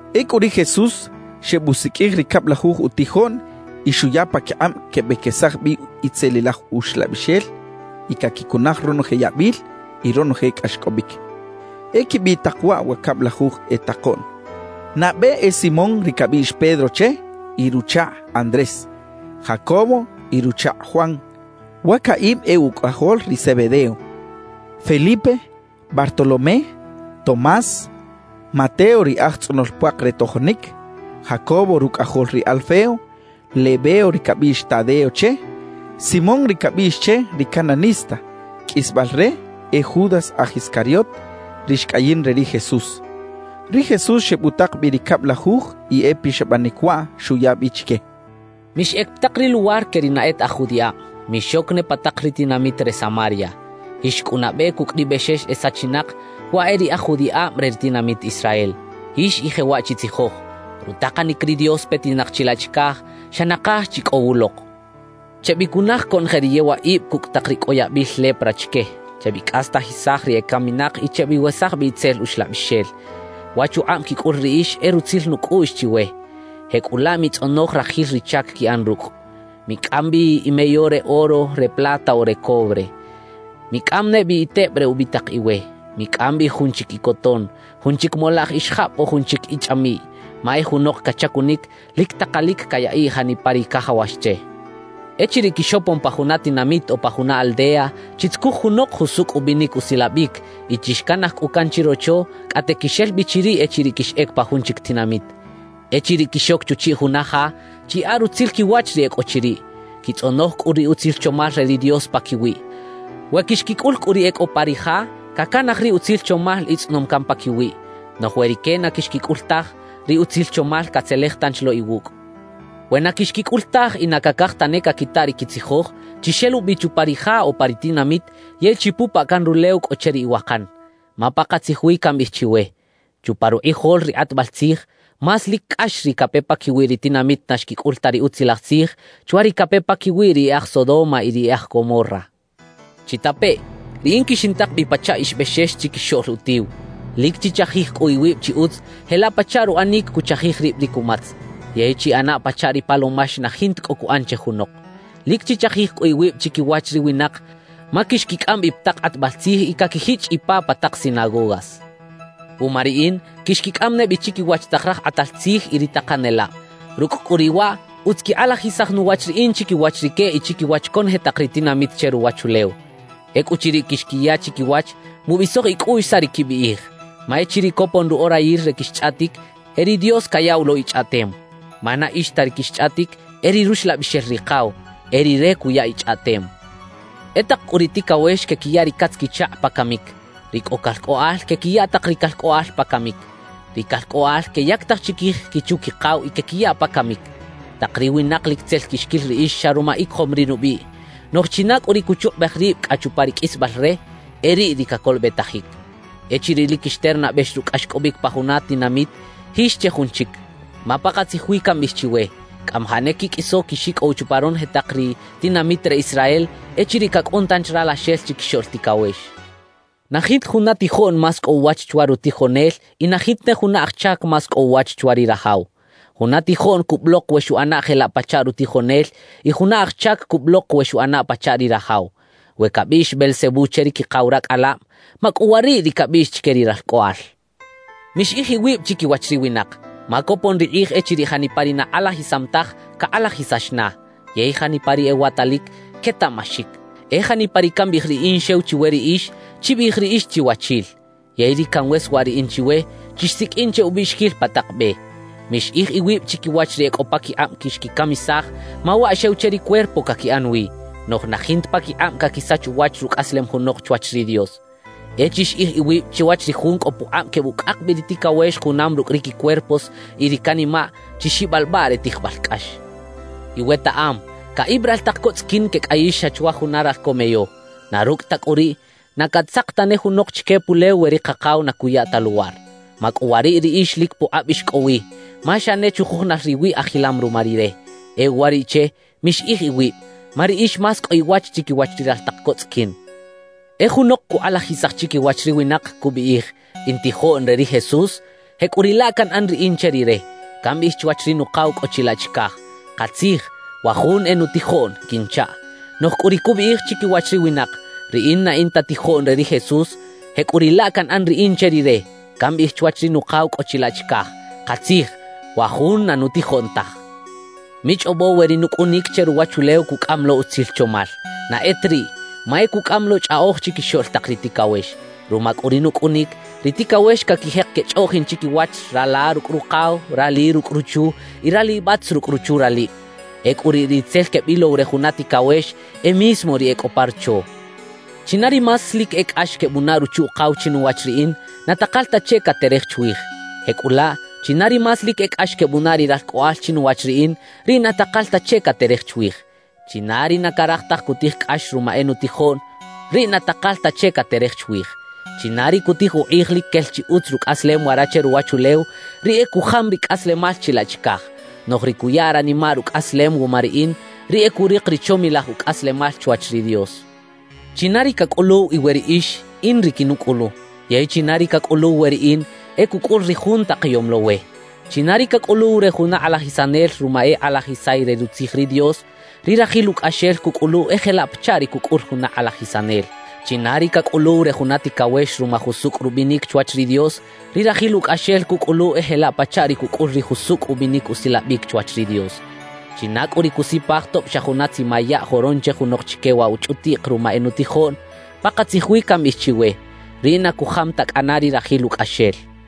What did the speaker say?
Ecꞌu ri Jesús xebusiqꞌuij ri cablajuj utijoꞌn y xuya paquikꞌab quebequesaj bi itzelilaj uxlabixel y caquicunaj ronoje yabil y ronoje cꞌaxcꞌobic. E quibiꞌ tak waꞌ wa cablajuj e takoꞌn: Nabe e Simón ri cabiꞌx Pedro che y ruchakꞌ Andrés, Jacobo y ruchakꞌ Juan (wa caꞌib e ucꞌajol ri Zebedeo), Felipe, Bartolomé, Tomás, Mateo ri aj tzꞌonol puak re tojonic, Jacobo rucꞌajol ri Alfeo, Lebeo ri cabiꞌx Tadeo che, Simón ri cabiꞌx che “ri Cananista”, qꞌuisbal re, e Judas aj Iscariot, ri xcꞌayin re ri Jesús. Ri Jesús xebutak bi ri cablajuj y e pixabanic waꞌ xuya bi chique: «Mixꞌec pa tak ri luwar que ri na e ta aj judiꞌab, mixoc ne pa tak ri tinamit re Samaria. Jix cꞌu nabe cucꞌ ri bexex e sachinak, waꞌ e ri e aj judiꞌab re ri tinamit Israel. Jix y jewaꞌ chitzijoj: “Rutakanic ri Dios petinak chilaꞌ chicaj xa nakaj chi cꞌo wulok.” »Chebicunaj conoje ri yewaꞌib cucꞌ tak ri cꞌo ri yabil lepra chique, chebicꞌastajisaj ri ecaminak y chebiwesaj bi itzel uxlabixel. Wa chukꞌab quicꞌul riꞌix e rutzil nucꞌuꞌx chiwe; jecꞌulaꞌ mitzꞌonoj rajil ri chac quiꞌan rucꞌ. »Micꞌam bi imeyo re oro, re plata o re cobre. Micꞌam ne bi teb re ubitak iwe, micꞌam bi jun chic icoton, jun chic molaꞌj ixajab o jun chic ichꞌamiꞌy. Ma e junok cachacunic, lic takalic cayaꞌiꞌ janipa ri cajawax che. »Echiriꞌ quixopon pa juna tinamit o pa juna aldea, chitzucuj junok jusucꞌ ubinic usilabic y chixcanaj cꞌu can chirocho cꞌate quixel bi chiriꞌ echiriꞌ quixꞌec pa jun chic tinamit. »Echiriꞌ quixoc chuchiꞌ juna ja, chiyaꞌa rutzil quiwach ri e cꞌo chiriꞌ, quitzꞌonoj cꞌu ri utzil chomal re ri Dios paquiwiꞌ. We quixquicꞌul cꞌu ri e cꞌo pa ri ja, cacanaj ri utzil chomal itzꞌonom can paquiwiꞌ. Noꞌj we rique na quixquicꞌul taj, ri utzil chomal catzelej tanchi lo iwucꞌ. »We na quixquicꞌul taj y na cacaj tane caquita ri quitzijoj, chixelubi chupa ri ja o pa ri tinamit yey chipupaꞌ can rulew cꞌo che ri iwakan. Ma pakatzij wi cambiꞌij chiwe: Chupa rukꞌijol ri kꞌatbal tzij, más lic cꞌax ri cape paquiwi ri tinamit na xquicꞌul ta ri Utzilaj Tzij, chwa ri cape paquiwi ri e aj Sodoma y ri e aj Gomorra. »Chitapeꞌ: Riꞌin quixintak bi pachaꞌ ix bexex chiquixoꞌl utiw. Lic chichajij cꞌu iwib chi utz jelaꞌ pachaꞌ ruꞌanic cuchajij rib ri cumatz, yey chiꞌana pachaꞌ ri palomax na jinta cꞌo cuꞌan che junok. »Lic chichajij cꞌu iwib chiquiwach ri winak, ma quixquicꞌam bi pa tak kꞌatbal tzij y caquijichꞌ ipa pa tak sinagogas. Wuma riꞌin, quixquicꞌam ne bi chiquiwach tak raj kꞌatal tzij y ri takanelab. Rucꞌ cꞌu riꞌ waꞌ, utz quikꞌalajisaj nuwach riꞌin chiquiwach rique y chiquiwach conoje tak ri tinamit che ruwachulew. Ecꞌuchiriꞌ quixquiya chiquiwach, mubisoj icꞌuꞌx saꞌ ri quibiꞌij; ma echiriꞌ copon ruꞌorayil re quixchꞌaꞌtic, e ri Dios cayaꞌw lo ichꞌaꞌtem. Ma na ix ta ri quixchꞌaꞌtic, e ri Ruxlabixel Rikaw; e Rire cuya ichꞌaꞌtem. »E tak cꞌu ri ticawex quequiya ri catz-quichakꞌ pa camic; ri cꞌo calcꞌoꞌal quequiya tak ri calcꞌoꞌal pa camic; ri calcꞌoꞌal queyactaj chiquij quichu-quikaw y quequiya pa camic. Tak ri winak lic tzel quixquil riꞌix xa ruma icojom ri nubiꞌ; noꞌj china cꞌu ri cuchukꞌubej rib cꞌa chupa ri qꞌuisbal re, e riꞌ ri cacolobetajic. Echiriꞌ lic quixternabex rucꞌ cꞌaxcꞌobic pa juna tinamit, jix che jun chic. Ma pakatzij wi cambiꞌij chiwe, cꞌamajaꞌ ne quiqꞌuiso quixicꞌow chupa ronoje tak ri tinamit re Israel, echiriꞌ cacꞌun tanchi Ralaxel Chiquixoꞌl Ticawex. »Na jinta juna tijoꞌn más cꞌo uwach chwa rutijonel y na jinta ne juna aj chac más cꞌo uwach chwa ri rajaw. Juna tijoꞌn cubulok we xuꞌana jelaꞌ pachaꞌ rutijonel y juna aj chac cubulok we xuꞌana pachaꞌ ri rajaw. We cabiꞌx “Beelzebú” che ri quikaw racꞌalab, ¿macꞌuwariꞌ ri cabiꞌx chique ri ralcꞌoꞌal? »Mixiꞌij iwib chiquiwach ri winak. Ma copon ri kꞌij echiriꞌ janipa ri na kꞌalajisam taj, cakꞌalajisax na; yey janipa ri ewatalic, quetaꞌmaxic. E janipa ri cambiꞌij riꞌin xew chiwe riꞌix, chibiꞌij riꞌix chiwachil; yey ri canweswaꞌ riꞌin chiwe, chixsiqꞌuin che ubiꞌxiquil pa tak be. »Mixiꞌij iwib chiquiwach ri cꞌo paquikꞌab quixquicamisaj, ma waꞌ xew che ri cuerpo caquiꞌan wi, noꞌj na jinta paquikꞌab caquisach uwach rucꞌaslem junok chwach ri Dios. E chixiꞌij iwib chwach ri Jun cꞌo pukꞌab quebucꞌak bi ri ticawex junam rucꞌ ri quicuerpos y ri canimaꞌ, chi xibalbaꞌ re tijbal cꞌax. »Iwetaꞌam, caꞌib raltak co tzꞌiquin quecꞌayix xa chwa jun ralco meyo. Na rucꞌ ta cꞌu riꞌ, na catzak tane junok chique pulew we ri Kakaw na cuya ta luwar. Macꞌuwariꞌ riꞌix lic pukꞌab ix cꞌo wi, ma xa ne chujujunal riwiꞌ ajilam ruma Rire. E uwariꞌche, mixiꞌij iwib; ma riꞌix más cꞌo iwach chiquiwach ri raltak co tzꞌiquin. »E junok cukꞌalajisaj chiquiwach ri winak, cubiꞌij: “In tijoꞌn re ri Jesús”; jecꞌuriꞌlaꞌ canꞌan riꞌin che rire, cambiꞌij chwach ri Nukaw cꞌo chilaꞌ chicaj: “Katzij, wa jun e nutijoꞌn” quinchaꞌ. »Noꞌj cꞌu ri cubiꞌij chiquiwach ri winak: “Riꞌin na in ta tijoꞌn re ri Jesús.” Jecꞌuriꞌlaꞌ canꞌan riꞌin che rire, cambiꞌij chwach ri Nukaw cꞌo chilaꞌ chicaj: “Katzij, wa jun na nutijoꞌn taj” quinchaꞌ. »Michꞌobo we ri nucꞌunic che ruwachulew cucꞌam lo utzil chomal. Na e ta riꞌ, ma e cucꞌam lo chꞌaꞌoj chiquixoꞌl tak ri ticawex. Ruma cꞌu ri nucꞌunic, ri ticawex caquijek quechꞌoꞌjin chiquiwach rala rucꞌ rukaw, rali rucꞌ ruchu y ralibatz rucꞌ ruchu-ralib. Ecꞌu riꞌ ri tzel quebilow re juna ticawex, e mismo ri e cꞌo pa rocho. »China ri más lic e cꞌax quebunaꞌ ruchu-ukaw chinuwach riꞌin, na takal ta che caterej chwij; jecꞌulaꞌ china ri más lic e cꞌax quebunaꞌ ri ralcꞌoꞌal chinuwach riꞌin, riꞌ na takal ta che caterej chwij. »China ri na caraj taj cutij cꞌax ruma e nutijoꞌn, riꞌ na takal ta che caterej chwij. China ri cutij ukꞌij lic quel chi utz rucꞌaslem wara che ruwachulew, riꞌ e cujam ri cꞌaslemal chilaꞌ chicaj; noꞌj ri cuya ranimaꞌ rucꞌaslem wuma riꞌin, riꞌ e curik ri chomilaj ucꞌaslemal chwach ri Dios. »China ri cacꞌuluw iwe riꞌix, in ri quinucꞌulu; yey china ri cacꞌuluw we riꞌin, e cucꞌul ri Jun takayom lo we. China ri cacꞌuluw re juna kꞌalajisanel ruma e kꞌalajisay re rutzij ri Dios, ri rajil ucꞌaxel cucꞌulu e jelaꞌ pachaꞌ ri cucꞌul juna kꞌalajisanel. China ri cacꞌuluw re juna ticawex ruma jusucꞌ rubinic chwach ri Dios, ri rajil ucꞌaxel cucꞌulu e jelaꞌ pachaꞌ ri cucꞌul ri jusucꞌ ubinic usilabic chwach ri Dios. China cꞌu ri cusipaj tob xa juna tzima yaꞌ joron che junok chique waꞌ wa chꞌutiꞌk ruma e nutijoꞌn, pakatzij wi cambiꞌij chiwe, riꞌ na cujam ta cꞌana ri rajil ucꞌaxel» xcha ri Jesús.